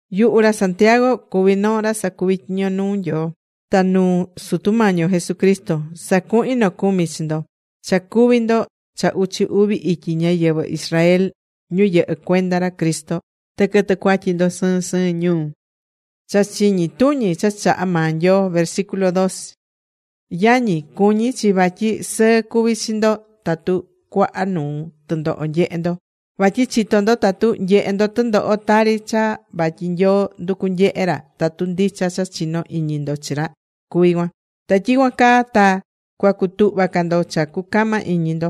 Yuhu ra Santiago cuví noo ra sacuví tyiño nuu Nyoo ta nuu Sutu Mañi yo Jesucristo. Sacuhín nocumi chi ndo cha cuví ndo cha uchi uvi ityi ñáyɨvɨ Israel ñu yɨhɨ́ cuenda ra Cristo. Ta quɨtɨ̱ cuatyi ndo sɨɨn sɨɨn ñuu.Cha chiñi tuñi cha chahá maa Nyoo Yañi, cuñí chi vatyi sɨɨ cuví chi ndo tatu cuaha nuu tɨndoho nyehé ndo. Vatyi chitó ndo tatu nyehé ndo tɨndoho tari cha vatyi Nyoo nducu nyehé ra tatu ndicha cha chinó iñi ndo chi ra cuví cuan. Ta tyicuan caa ta cua cutuhva ca ndo cha cucama iñi ndo.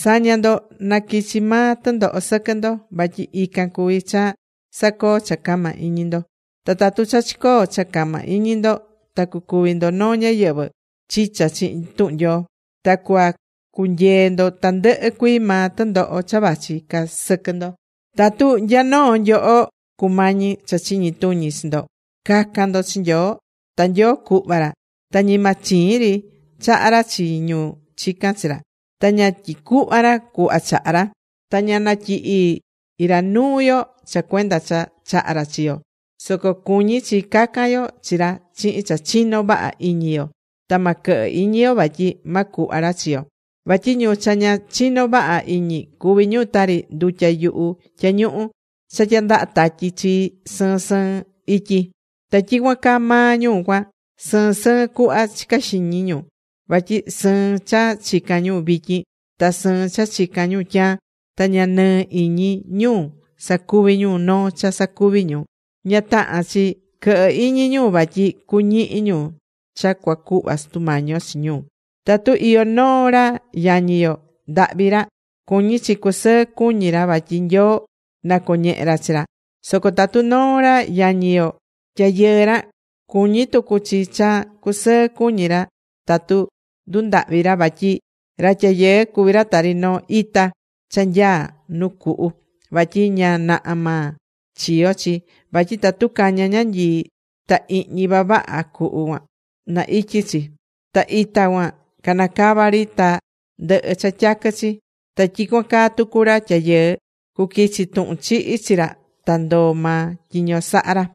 Sa̱ña ndo na quichi maa tɨndoho sɨquɨ ndo, vatyi ican cuví cha sacoó cha cama iñi ndo. Ta tatu cha chicoo cha cama iñi ndo ta cucuvi ndo noo ñáyɨvɨ chicha chihin tuhun Nyoo, ta cuacunyee ndo tandɨhɨ cuii maa tɨndoho cha vachi ca sɨquɨ ndo. Tatu nya noo nyoho cumañí cha chiñi tuñi chi ndo, ca̱can ndo chi Nyoo. Ta Nyoo cuhva ra. Ta ñima chiin ri chahá ra chi ñu chicán chi ra. Ta ña tyicuhvá ra cuhva chahá ra. Ta ña natyihí ra nuu yo cha cuenda cha chahá ra chi yo. Soco cuñí chi ca̱can yo chi ra chihin cha chinó vaha iñi yo. Ta ma quɨhɨ iñi yo vatyi ma cuhva ra chi yo. Vatyi ñu cha ña chinó vaha iñi, cuví ñu tari ndutya yuhu tyañuhu cha tyandahá tatyi chii sɨɨn sɨɨn ityi. Ta tyicuan caa maa ñu cuan, sɨɨn sɨɨn cuhva chicá xiñi ñu, vatyi sɨɨn cha chicán ñu vityin ta sɨɨn cha chicán ñu tyaan, ta ña nɨɨ iñi ñu sacuví ñu noo cha sacuví ñu. Ña tahán chi quɨhɨ iñi ñu vatyi cuñihi ñu cha cuacuhva Sutu Mañi yo chi ñu. Tatu iyó noo ra yañi yo, ndahvi ra, cuñí chi cusɨɨ cuñí ra vatyi Nyoo nacoñehé ra chi ra. Soco tatu noo ra yañi yo, tyayɨɨ ra, cuñí tucu chi cha cusɨɨ cuñí ra tatu ndundahvi ra, vatyi ra tyayɨɨ cuví ra tari noo ita cha nyaá nu cuhu, vatyi ña naha maa chiyó chi. Vatyi tatu cañá ñanyii ta ihñi vavaha cuhu cuan, na ityi chi. Ta ita cuan canacavá ri ta ndɨhɨ cha tyaquɨ chi. Ta tyicuan caa tucu ra tyayɨɨ, cuquichi tuhun chihi chi ra ta ndoó maa tyiño sahá ra.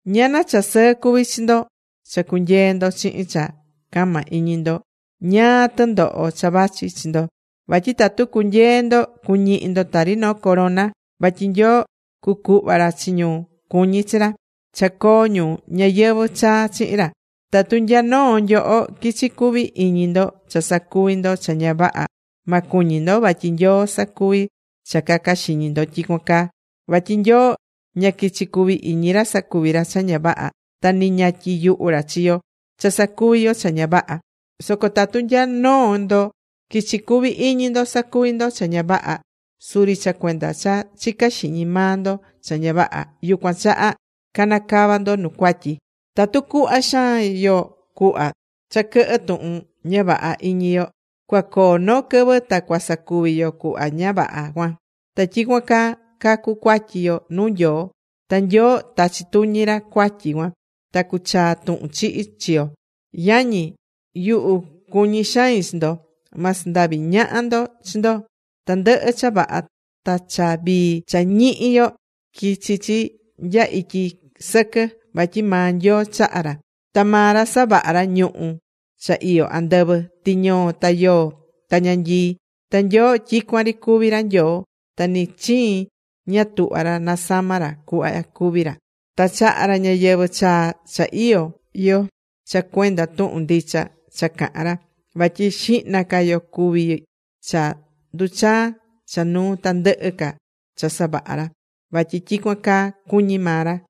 Ñana cha sɨɨ cuví chi ndo cha cunyeé ndo chihin cha cama iñi ndo ñáá tɨndoho cha vachí chi ndo. Vatyi tatu cunyeé ndo, cuñihi ndo tari noo corona. Vatyi Nyoo cucuhva ra chi ñu cuñí chi ra, cha coo ñu ñayɨvɨ̱ chaa chihin ra. Tatu nya noo nyoho quichí cuví iñi ndo cha sacuvi ndo cha ña vaha, ma cuñi ndo vatyi Nyoo sacuví cha caca xiñi ndo tyicuan caa. Vatyi Nyoo ña quichí cuví iñi ra sacuví ra cha ña vaha. Ta ni ña tyiyuhú ra chi yo cha sacuví yo cha ña vaha. Soco tatu nya noo ndo quichí cuví iñi ndo sacuví ndo cha ña vaha, suri cha cuenda cha chicá xiñi maa ndo cha ña vaha, yucuan chaha canacava ndo nu cuatyi. Tatu cuhva xaan yo cuhva cha quɨhɨ tuhun ña vaha iñi yo, cuacoo noo quɨvɨ ta cuasacuvi yo cuhva ña vaha cuan, ta tyicuan caa cacu cuatyi yo nuu Nyoo. Ta Nyoo tachi tuñi ra cuatyi cuan ta cuchaa tuhun chihi chi yo. Yañi yuhu, cuñí xain chi ndo. Ma sandavi ñaha ndo chi ndo. Tandɨhɨ cha vaha ta cha vii cha ñihí yo, quichi chi nya ityi sɨquɨ vatyi maa Nyoo chahá ra. Ta maa ra savaha̱ ra ñuhu̱ cha iyó andɨvɨ: tɨñoo, ta yoo, ta ñanyii. Ta Nyoo tyicuan ri cuví ra Nyoo, ta ni chiin ña tuhvá ra nasama ra cuhva cuví ra. Ta chahá ra ñayɨvɨ̱ chaa cha iyó yo cha cuenda tuhun ndicha cha cahán ra. Vatyi xihna ca yo cuví cha nduchaá cha nuu tandɨhɨ ca cha savaha̱ ra. Vatyi tyicuan caa cuñi̱ maa ra.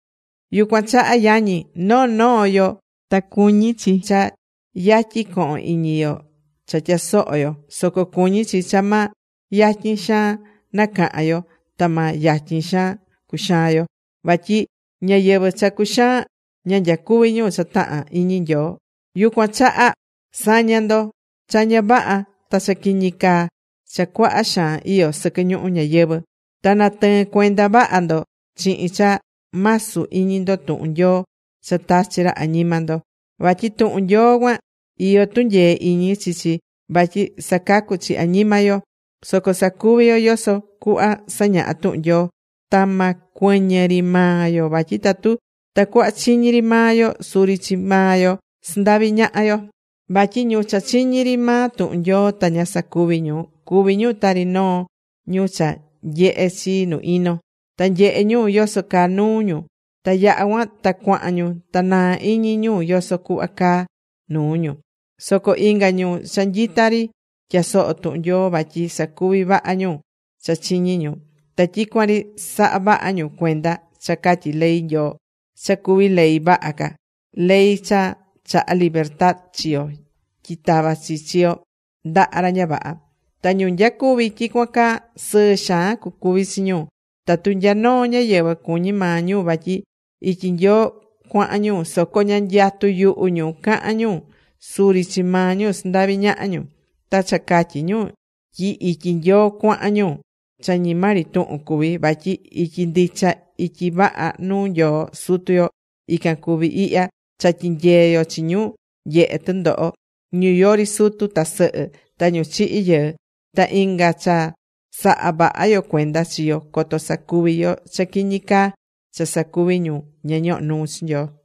Yucuan chaha yañi, noo noo yo ta cuñí chi cha yatyi co̱hon iñi yo cha tyasoho yo, soco cuñí chi cha ma yatyi xaan nacahán yo ta ma yatyi xaan cuxaan yo. Vatyi ñáyɨvɨ cha cuxaán, ña nyacuví ñu cha tahán iñi Nyoo. Yucuan chaha sa̱ña ndo cha ña vaha ta cha quiñi caa cha cuaha xaan iyó sɨquɨ ñuhu ñayɨvɨ̱. Ta na̱tɨɨn cuenda vaha ndo chihin cha masu iñi ndo tuhun Nyoo cha tachi̱ ra añima ndo. Vatyi tuhun Nyoo cuan iyó tunyee iñi chi chi vatyi sacacú chi añima yo. Soco sa̱cuvi yo yoso cuhva sañahá tuhun Nyoo. Ta ma cuɨñɨ ri maa yo vatyi tatu tacuhva chiñí ri maa yo, suri chi maa yo sandavi ñahá yo. Vatyi ñu cha chiñí ri maa tuhun Nyoo ta ña sacuví ñu, cuví ñu tari noo ñu cha nyehé chi nu ino. Ta nyehé ñu yoso caa nuu ñu, ta yaha cuan ta cuahan ñu ta naá ri iñi ñu yoso cuhva caá nuu ñu. Soco inga ñu cha nyita ri tyasohó tuhun Nyoo, vatyi sacuví vaha ñu cha chiñí ñu. Ta tyicuan ri sahá vaha ñu cuenda cha catyí ley Nyoo, cha cuví ley vaha ca, ley cha chahá libertad chi yo tyi tava chi chi yo ndaha ra ña vaha. Ta ñu nyacuví tyicuan caa sɨɨ xaan cucuvi chi ñu. Tatu nya noo ñáyɨvɨ cuñí maa ñu vatyi ityi Nyoo cuahan ñu, soco ña nyatú yuhu ñu cahan ñu, suri chi maa ñu sandahvi ñahá ñu. Ta cha catyí ñu tyi ityi Nyoo cuahan ñu, cha ñima ri tuhun cuví. Vatyi ityi ndicha, ityi vaha nuu Nyoo Sutu yo ican cuví ihya: Cha tyinyeé yo chi ñu nyehe tɨndoho, ñu yori sutu ta sɨhɨ, ta ñu chihi̱ yɨɨ. Ta inga, cha sahá vaha yo cuenda chi yo coto sacuvi yo cha quiñi caa cha sacuví ñu ña ñohó nuu Nyoo.